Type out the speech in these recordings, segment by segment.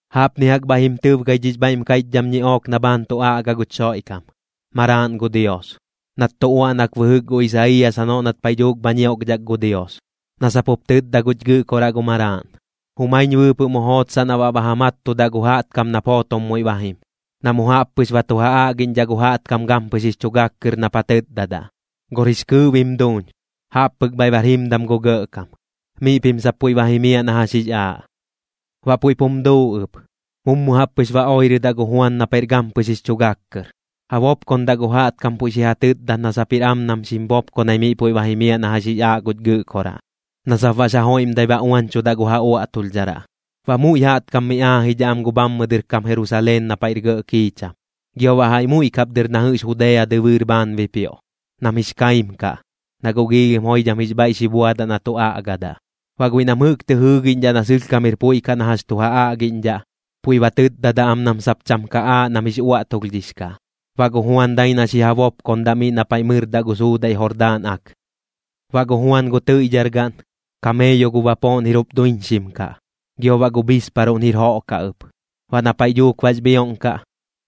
Jaꞌpni jaꞌk bhaiꞌ jim tɨbgai dhix bhaiꞌm kaiꞌchdham ñiꞌook na bhaan tu aꞌga guch Xoiꞌkam, Maraaꞌn gu Dios, nat tu uaꞌnak bɨjɨk gu Isaiiyas janoꞌ nat paiꞌ dhuuk bha ñioꞌkdhak gu Dios, na sap jup tɨtda guch Gɨꞌkoraꞌ gu Maraaꞌn: Jumaiñ bɨɨpɨꞌ mu jootsaꞌ na baꞌ ba ja mattudaꞌ gu jaꞌtkam nap jootom muiꞌ ba jim. Na mu jaꞌp pɨx ba tu ja aꞌgiꞌñdhaꞌ gu jaꞌtkam gampɨx jix chu gak kɨr nap ja tɨtdadaꞌ: “Gor jix kɨɨꞌ bim duuñ. Jaꞌp pɨk bhaiꞌ bar jimdam gu Gɇꞌkam. Miꞌ pim sap puiꞌ ba jimiaꞌ na jax jix aaꞌ.” Baꞌ puiꞌp jum duu ɨp, mummu jaꞌp pɨx ba oirɨdaꞌ gu Juan na paiꞌr gampɨx jix chu gak kɨr, ja bopkondaꞌ gu jaꞌtkam puiꞌ xi ja tɨtdat na sap jir am nam xim bopkonai miꞌ puiꞌ ba jimiaꞌ na jax jix aaꞌ guch Gɨꞌkoraꞌ, na sap baꞌx ja joiꞌmdai ba uañchudaꞌ gu ja uaꞌtulhdharaꞌ. Baꞌ muiꞌ jaꞌtkam miꞌ aajidhaꞌ am gu bhammɨ dɨr kam Jerusaleen na paiꞌr gɇꞌ kiicham, gio baꞌ jaiꞌ muiꞌ kap dɨr na jɨꞌx Judea dɨbɨɨr bhaan bipioꞌ, nam jix kaim kaꞌ, na guꞌ giilhim joidham jix bhaiꞌ xi buadaꞌ na tu aꞌgadaꞌ. Baꞌ guiꞌ nam jɨꞌk tɨ jɨɨgiꞌñdhaꞌ na sɨlhkam jir puiꞌ na jax tu ja aꞌgiꞌñdhaꞌ, puiꞌ ba tɨtdadaꞌ am nam sap cham ka aaꞌ nam jix uaꞌtulhdhix kaꞌ. Baꞌ gu Juan dai na xi ja bopkondaꞌ miꞌ na paiꞌ mɨrdaꞌ gu suudaiꞌ Jordaan Ak. Baꞌ gu Juan gu tɨiꞌdhargaꞌn, kameeyo gu bapooꞌn jir jup duiñxim kaꞌ, gio baꞌ gu bhisparuꞌn jir joꞌ kaꞌ ɨp. Baꞌ na paiꞌ dhuuk bax bhioꞌn kaꞌ,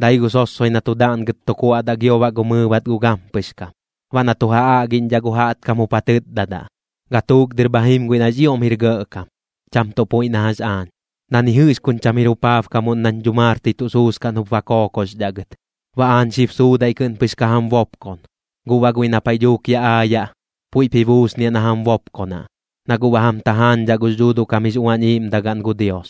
dai gu sossoi na tu daꞌngɨt tu kuaꞌdaꞌ gio baꞌ gu mɨɨbat gu gampɨx kam. Baꞌ na tu ja aꞌgiꞌñdhaꞌ gu jaꞌtkam jup ja tɨtdadaꞌ: ―Gatuuk dɨr bha jim guiꞌ nax ioꞌm jir gɇꞌkam, cham tuꞌ puiꞌ na jax aañ, na ni jɨꞌx kuñ cham jir jupaabkamuꞌn nañ dhumartɨi tuꞌ suskaꞌn jup ba kookoxdhaꞌ gɨt. Baꞌ aañ xib suudaiꞌ kɨꞌn pɨx ka jam bopkon, guꞌ baꞌ guiꞌ na paiꞌ dhuuk yaꞌ aayaꞌ, puiꞌp ji buusniaꞌ na jam bopkonaꞌ, na guꞌ ba jam tajaañdhaꞌ gux Dhuuduꞌ kam jix Uañ Iiꞌmdagaꞌn gu Dios.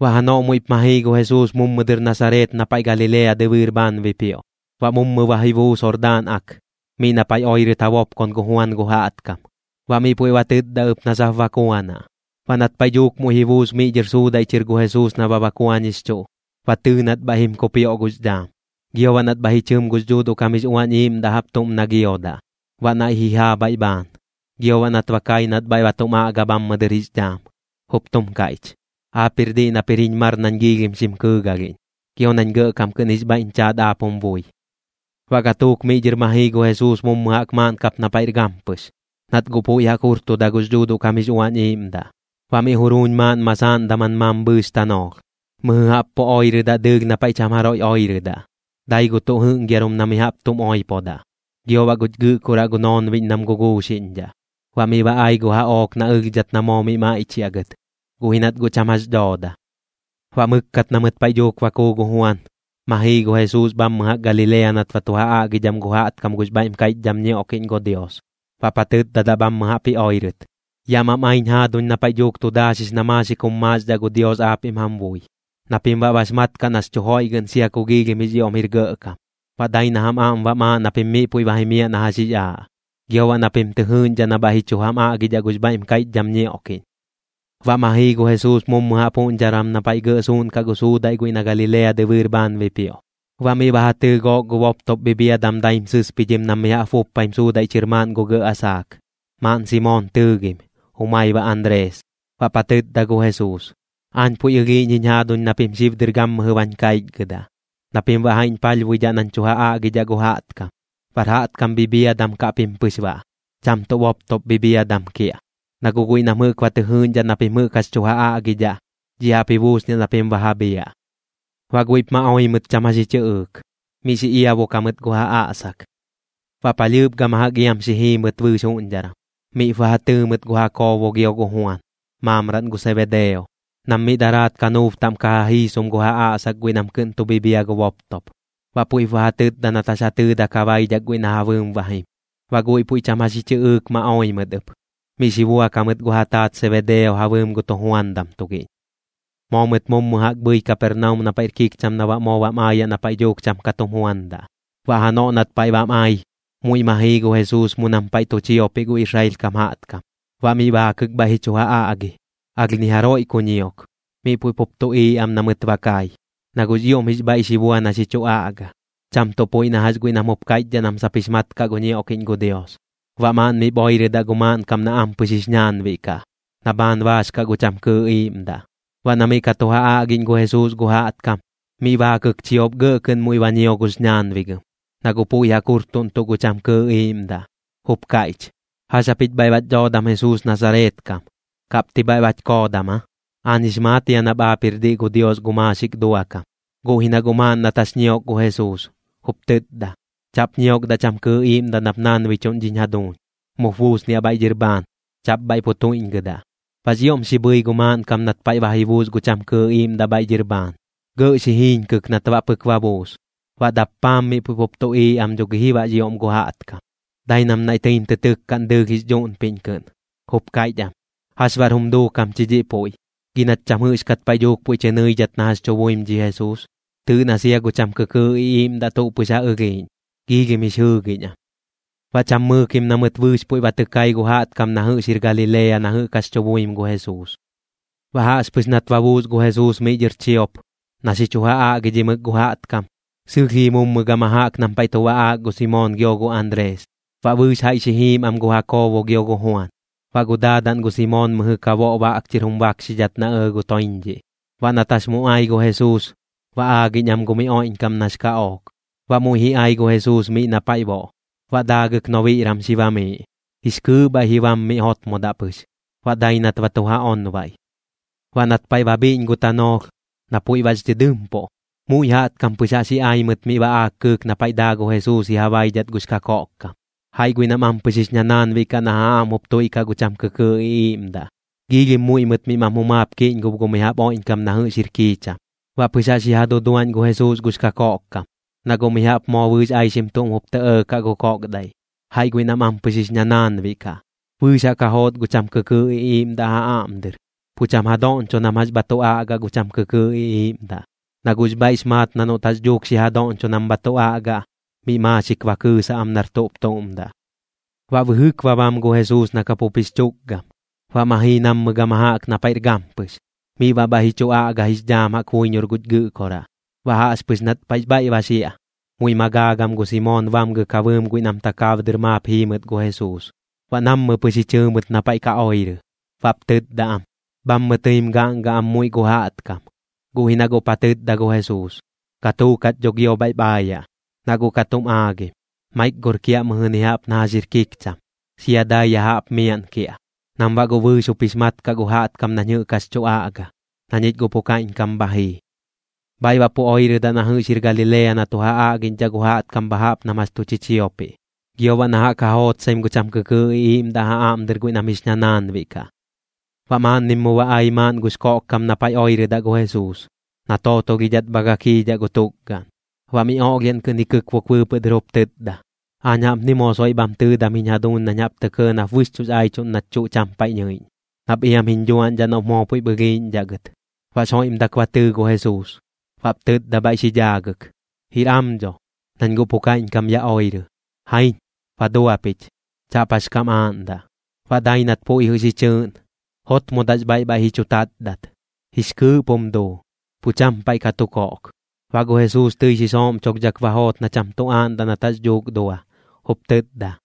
Baꞌ janoꞌ muiꞌp ma jii gu Jesuus mummu dɨr Nasareet na paiꞌ Galilea dɨbɨɨr bhaan bipioꞌ. Baꞌ mummu ba ji buus Jordaan Ak miꞌ na paiꞌ oirɨt ja bopkon gu Juan gu jaꞌtkam, baꞌ miꞌ puiꞌ ba tɨtda ɨp na sap bakuanaꞌ. Baꞌ nat paiꞌ dhuuk muiꞌ ji buus miꞌ dhɨr suudaiꞌ chɨr gu Jesuus na ba bakuañixchuꞌ, ba tɨɨ nat bhaiꞌ jim kupioꞌ gux dhaam, gio baꞌ nat bhaiꞌ ji chɨm gux Dhuuduꞌ kam jix Uañ Iiꞌmdaꞌ jaꞌp tuꞌm na giodaꞌ, baꞌ naiꞌ ji jaa bhaiꞌ bhaan. Gio baꞌ nat ba kai nat bhaiꞌ ba tum aꞌga bhammɨ dɨr jix dhaam, jup tum kaiꞌch: ―Aap jir diꞌ nap jir jiñ mar nañ xim kɨɨgalhiꞌñ, gio nañ gɇꞌkam kɨꞌn jix bhaiꞌñ chaat aap jum bui. Baꞌ gatuuk miꞌ dhɨr ma jii gu Jesuus mummu jaꞌk maaꞌn kap na paiꞌr gampɨx, nat guꞌ puiꞌ jaꞌk jurtuda gux Dhuuduꞌ kam jix Uañ Iiꞌmdaꞌ. Baꞌ miꞌ juruuñ maaꞌn masaaꞌn daman mambhɨɨx tanoolh, mɨjɨ jaꞌp pu oirɨdaꞌ dɨɨlh na paiꞌ cham jaroiꞌ oirɨdaꞌ. Dai gu tuꞌ jɨꞌngiarum na mi jaꞌp tum oipodaꞌ, gio baꞌ guch Gɨꞌkoraꞌ gu noonbiꞌñ nam guguuxiꞌñdhaꞌ. Baꞌ miꞌ ba ai gu jaꞌook na ɨlhdhat na moo miꞌ maiꞌchiaꞌ gɨt, guꞌ ji nat guꞌ cham jax dhooda. Baꞌ mɨkkat na mɨt paiꞌ dhuuk ba kuu gu Juan, ma jii gu Jesuus bhammɨ jaꞌk Galilea nat ba tu ja aꞌgidham gu jaꞌtkam gux bhaiꞌm kaiꞌchdham ñioꞌkiꞌñ gu Dios. Baꞌp ja tɨtdadaꞌ bhammɨ jaꞌp ji oirɨt: ―Yaꞌ mam aiñ jaaduñ na paiꞌ dhuuk tu daaxix na maaxik jum maaxdhaꞌ gu Dios aapiꞌm jam bui, na pim baꞌ bax mat kaꞌ nax chu joiꞌgɨꞌn sia kux ioꞌm jir gɇꞌkam. Baꞌ dai na jam aꞌm bam aaꞌ na pim miꞌ puiꞌ ba jimiaꞌ na jax jix aaꞌ, gio baꞌ na pim tɨ jɨɨꞌñdhaꞌ na bhaiꞌ ji chu jam aꞌgidhaꞌ gux bhaiꞌm kaiꞌchdham ñioꞌkiꞌñ. Baꞌ ma jii gu Jesuus mummu jaꞌp juꞌñdharan na paiꞌ gɇꞌ suuꞌnkaꞌ gu suudaiꞌ guiꞌ na Galilea dɨbɨɨr bhaan bipioꞌ. Baꞌ miꞌ ba ja tɨɨ gook gu boptop bhibhiadam daim sɨspidhim nam mi jaꞌp buppaim suudaiꞌ chɨr maaꞌn gu gɇꞌ asaak. Maaꞌn Simoon tɨɨgim, jumai baꞌ Anrees. Baꞌp ja tɨtda gu Jesuus: ―Aañ puiꞌ ɨlhiiꞌñ jiñ jaaduñ na pim xib dɨr gammɨjɨ bañ kaichgɨdaꞌ, na pim baꞌ jaiꞌñ palhbuidhaꞌ nañ tu ja aꞌgidhaꞌ gu jaꞌtkam. Bar jaꞌtkam bhibhiadam kaꞌ pim pɨx baꞌ, cham tuꞌ boptop bhibhiadam kiaꞌ, na guꞌ guiꞌ nam jɨꞌk ba tɨ jɨɨꞌñdhaꞌ na pim jɨꞌk jax tu ja aꞌgidhaꞌ, dhiꞌ jaꞌp ji buusniaꞌ na pim ba ja bhiaꞌ. Baꞌ guiꞌp ma oi mɨt cham jax ji chɨꞌɨɨk. Miꞌ xi iabok jamɨt gu ja aꞌsak. Baꞌ palhɨɨp gama jaꞌk iam xi jii mɨt bɨɨx juꞌñdharan, miꞌp ba ja tɨɨ mɨt gu Jakoobo gio gu Juan, maamraꞌn gu Sebedeo, nam miꞌ daraat kanuub taꞌm ka ja jiisom gu ja aꞌsak guiꞌ nam kɨꞌn tu bhibhia gu boptop. Baꞌ puiꞌp ba ja tɨtda nat jax ja tɨɨdak ja baidhak guiꞌ na ja bɨɨm ba jim. Baꞌ guiꞌ puiꞌ cham jax ji chɨꞌɨɨk ma oi mɨt ɨp, miꞌ xi buak jamɨt gu ja taat Sebedeo ja bɨɨm gu tujuandam tugiꞌñ. Moo mɨt mummu jaꞌk bhɨi Kapernaum na paiꞌr kikcham na baꞌ moo bam aayaꞌ na paiꞌ dhuuk cham ka tum juandaꞌ. Baꞌ janoꞌ nat paiꞌ bam ai, muiꞌ ma jii gu Jesuus mu nam paiꞌ tu chiopiꞌ gu Israel kam jaꞌtkam. Baꞌ miꞌ baakɨk bhaiꞌ ji chu ja aꞌgi. Alh ni jaroiꞌ ku ñiok, miꞌ puiꞌ pup tuꞌiiꞌ am na mɨt ba kai, na guꞌx ioꞌm bhaiꞌ xi bua na xi chu aꞌga, cham tuꞌ puiꞌ na jax guiꞌ nam jup kaiꞌchdhaꞌ nam sap jix mat kaꞌ gu ñioꞌkiꞌñ gu Dios. Baꞌ maaꞌn miꞌp oirɨdaꞌ gu maaꞌnkam na ampɨx jix ñaanbiꞌ kaꞌ, na bhaan baax kaꞌ gu cham kɨɨꞌ iiꞌmdaꞌ. Baꞌ na miꞌ ka tu ja aꞌgiꞌñ gu Jesuus gu jaꞌtkam, miꞌ baakɨk chiop gɇꞌ kɨꞌn muiꞌ ba ñio gux ñaanbigɨm, na guꞌ puiꞌ jaꞌk jurtuꞌntuꞌ gu cham kɨɨꞌ iiꞌmdaꞌ, jup kaiꞌch: ―¿Jax japich bhaiꞌ bach dhoodam Jesuus Nasareet kam? ¿Kaꞌp ti bhaiꞌ bach koodam aa? ¡Aañ jix maat jia nap aap jir diꞌ gu Dios gu maaxik duakam! Guꞌ ji na guꞌ maaꞌn nat jax ñiok gu Jesuus, jup tɨtda: ―¡Chaꞌp ñiokdaꞌ cham kɨɨꞌ iiꞌmdaꞌ nap naanbichuꞌn dhiñ jaduuñ! ¡Mup buusniaꞌ bhaiꞌ dhɨr bhaan! ¡Chaꞌp bhaiꞌ pu tuiꞌñgɨdaꞌ! Baꞌx ioꞌm xi bhɨi gu maaꞌnkam nat paiꞌ ba ji buus gu cham kɨɨꞌ iiꞌmdaꞌ bhaiꞌ dhɨr bhaan. Gɇꞌ xi jiiñkɨk nat baꞌ pɨk ba buus. Baꞌ dappaam miꞌ puiꞌ pup tuꞌiiꞌ am dho gi ji baꞌx ioꞌm gu jaꞌtkam, dai nam naiꞌ tɨim tɨ tɨkkaꞌn dɨɨlh jix dhuꞌnpiꞌñ kɨꞌn, jup kaiꞌch am: ―¿Jax baꞌr jum duukam chi dhiꞌ puiꞌ? Gi nach cham jɨꞌxkat paiꞌ dhuuk puiꞌ chɨ nɨidhat na jax tu buim dhi Jesuus. Tɨɨꞌ na sia gu cham kɨkɨɨꞌ iꞌiiꞌmdaꞌ tuꞌ pɨx ja ɨlhiiꞌñ, jix jɨɨgiꞌñ am. Baꞌ cham mɨɨkim na mɨt bɨɨx puiꞌ ba tɨ kai gu jaꞌtkam na jɨꞌx jir Galilea na jɨꞌk jax tu buim gu Jesuus. Baꞌ jaꞌxpɨx nat ba buus gu Jesuus miꞌ dhɨr chiop, na xi chu ja aꞌgidhimɨk gu jaꞌtkam, sɨlh jii mummu gama jaꞌk nam paiꞌ tu baꞌaak gu Simoon gio gu Anrees. Baꞌ bɨɨx jaiꞌ xi jiim am gu Jakoobo gio gu Juan. Baꞌ gu daadaꞌn gu Simoon mɨjɨ ka boꞌ baꞌk chɨr jum bakxidhat na ɇɇ gu toiñdhiꞌ. Baꞌ nat jax mu ai gu Jesuus, ba aagiꞌñ am gu miꞌ oiꞌñkam nax kaꞌook. Baꞌ muiꞌ ji ai gu Jesuus miꞌ na paiꞌ boꞌ, baꞌ daagɨk nobiꞌran xi bamiiꞌ. Jix kɨɨꞌ bhaiꞌ ji bam miꞌ jotmodaꞌ pɨx, baꞌ dai nat ba tu ja onbaiꞌ. Baꞌ nat paiꞌ ba bhiꞌñ gu tanoolh, na puiꞌ bax dhɨdɨmpuꞌ, muiꞌ jaꞌtkam pɨx jaꞌx ji ai mɨt miꞌ baꞌaak kɨɨk na paiꞌ daa gu Jesuus ji ja baidhat gux kakoꞌkkam, jaiꞌ guiꞌ nam ampɨx jix ñanaanbiꞌ kaꞌ na ja aꞌm jup tuiꞌkaꞌ gu cham kɨkɨɨꞌ iꞌiiꞌmdaꞌ. Giilhim muiꞌ mɨt miꞌ mam jumaap kiꞌñgob gu mi jaꞌp oiꞌñkam na jɨꞌx jir kiicham. Baꞌ pɨx jaꞌx ji ja duduaꞌñ gu Jesuus gux kakoꞌkkam, na guꞌ mi jaꞌp moo bɨɨx aixim tuꞌm jup tɇ ɇɇkaꞌ gu koꞌkdaiꞌ. Jaiꞌ guiꞌ nam ampɨx jix ñanaanbiꞌ kaꞌ, bɨɨx jaꞌk ja joot gu cham kɨkɨɨꞌ iꞌiiꞌmdaꞌ ja aꞌm dɨr. Pu cham ja doꞌñcho nam jax bha tu aꞌga gu cham kɨkɨɨꞌ iꞌiiꞌmdaꞌ, na guꞌx bhaiꞌx maat na noꞌt jax dhuuk xi ja doꞌñcho nam bha tu aꞌgaꞌ, miꞌ maaxik ba kɨɨsaꞌ am nar tuꞌp tuꞌm daꞌ. Baꞌ bɨjɨk ba bam gu Jesuus na kapup jix chukgam, baꞌ ma jii nammɨ gama jaꞌk na paiꞌr gampɨx. Miꞌ baꞌ bhaiꞌ ji chu aꞌga jix dhaam jaꞌk buiñor guch Gɨꞌkoraꞌ. Baꞌ jaꞌxpɨx nat paiꞌx bhaiꞌ ba xiaꞌ, muiꞌp ma gaagam gu Simoon bamgɨk ja bɨɨm guiꞌ nam takaab dɨr maap jii mɨt gu Jesuus. Baꞌ nammɨ pɨx ji chɨɨ mɨt na paiꞌ ka oirɨ, baꞌp tɨtda am: ―Bhammɨ tɨim gaꞌngaꞌ am muiꞌ gu jaꞌtkam. Guꞌ ji na guꞌp ja tɨtda gu Jesuus: ―Gatuuk jach dho gio bhaiꞌp aayaꞌ, na guꞌ ka tum aagim. Maik gor kiaꞌ mɨjɨni jaꞌp na jax jir kikcham, sia dai ya jaꞌp miaꞌn kiaꞌ, nam baꞌ guꞌ bɨɨx jup jix mat kaꞌ gu jaꞌtkam nañ jɨꞌk jax tu aꞌga, na ñich guꞌ pu kaiꞌñkam bha jii. Bhaiꞌ baꞌ pu oirɨdaꞌ na jɨꞌx jir Galilea na tu ja aꞌgiꞌñdhaꞌ gu jaꞌtkam bha jaꞌp nam jax tu chichiopiꞌ. Gio baꞌ na jaꞌk ja jootsaim gu cham kɨkɨɨꞌ iꞌiiꞌmdaꞌ ja aꞌm dɨr guiꞌ nam jix ñanaanbiꞌ kaꞌ. Baꞌ maaꞌnnim mu ba ai maaꞌn gux koꞌkkam na paiꞌ oirɨdaꞌ gu Jesuus, na tootolhidhat bha gakiidhaꞌ gu tukgaꞌn. Baꞌ miꞌ oꞌlhiaꞌn kɨꞌn ji kɨkbuk bɨɨpɨꞌ dɨr jup tɨtda: ―Aañ jaꞌpni moo soiꞌ bham tɨɨdam jiñ jaduuñ nañ jaꞌp tɇ kɇɇ nap bɨxchuꞌx aichuꞌn nach chuꞌ cham paiꞌ nɨiꞌñ, nap iam jiñ dhuaꞌñdhaꞌ noꞌp moo puiꞌp ɨlhiiꞌñdhaꞌ gɨt. Baꞌx joiꞌmdak ba tɨɨ gu Jesuus, baꞌp tɨtda bhaiꞌ xi dhaagɨk: ―Jir am dho, nañ guꞌ pu kaiꞌñkam ya oirɨ. Jaiñ, ba dua pich. Chaꞌp jax kam aaꞌndaꞌ. Baꞌ dai nat puiꞌ jɨꞌ xi chɨɨꞌn, jotmodaꞌx bhaiꞌ bhaiꞌ ji chu taatdat. Jix kɨɨꞌp jum duu, pu cham paiꞌ ka tu koꞌk. Baꞌ gu Jesuus tɨi xi sooꞌmchulhdhak ba joot na cham tu aaꞌndaꞌ nat jax dhuuk dua, jup tɨtda: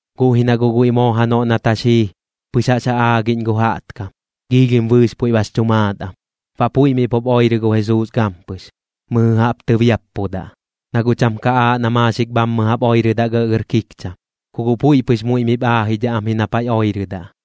Guꞌ ji na guꞌ guiꞌ moo janoꞌ nat jax jii, pɨx jaꞌx ja aagiꞌñ gu jaꞌtkam. Giilhim bɨɨx puiꞌ bax chu maat am. Baꞌ puiꞌ miꞌ pup oirɨ gu Jesuus gampɨx, mɨjɨ jaꞌp tɨbiappudaꞌ, na guꞌ cham ka aaꞌ na maaxik bhammɨ jaꞌp oirɨdaꞌ gɇꞌgɇr kikcham. Ku guꞌ puiꞌ pɨx muiꞌ miꞌp aajidhaꞌ am ji na paiꞌ oirɨdaꞌ.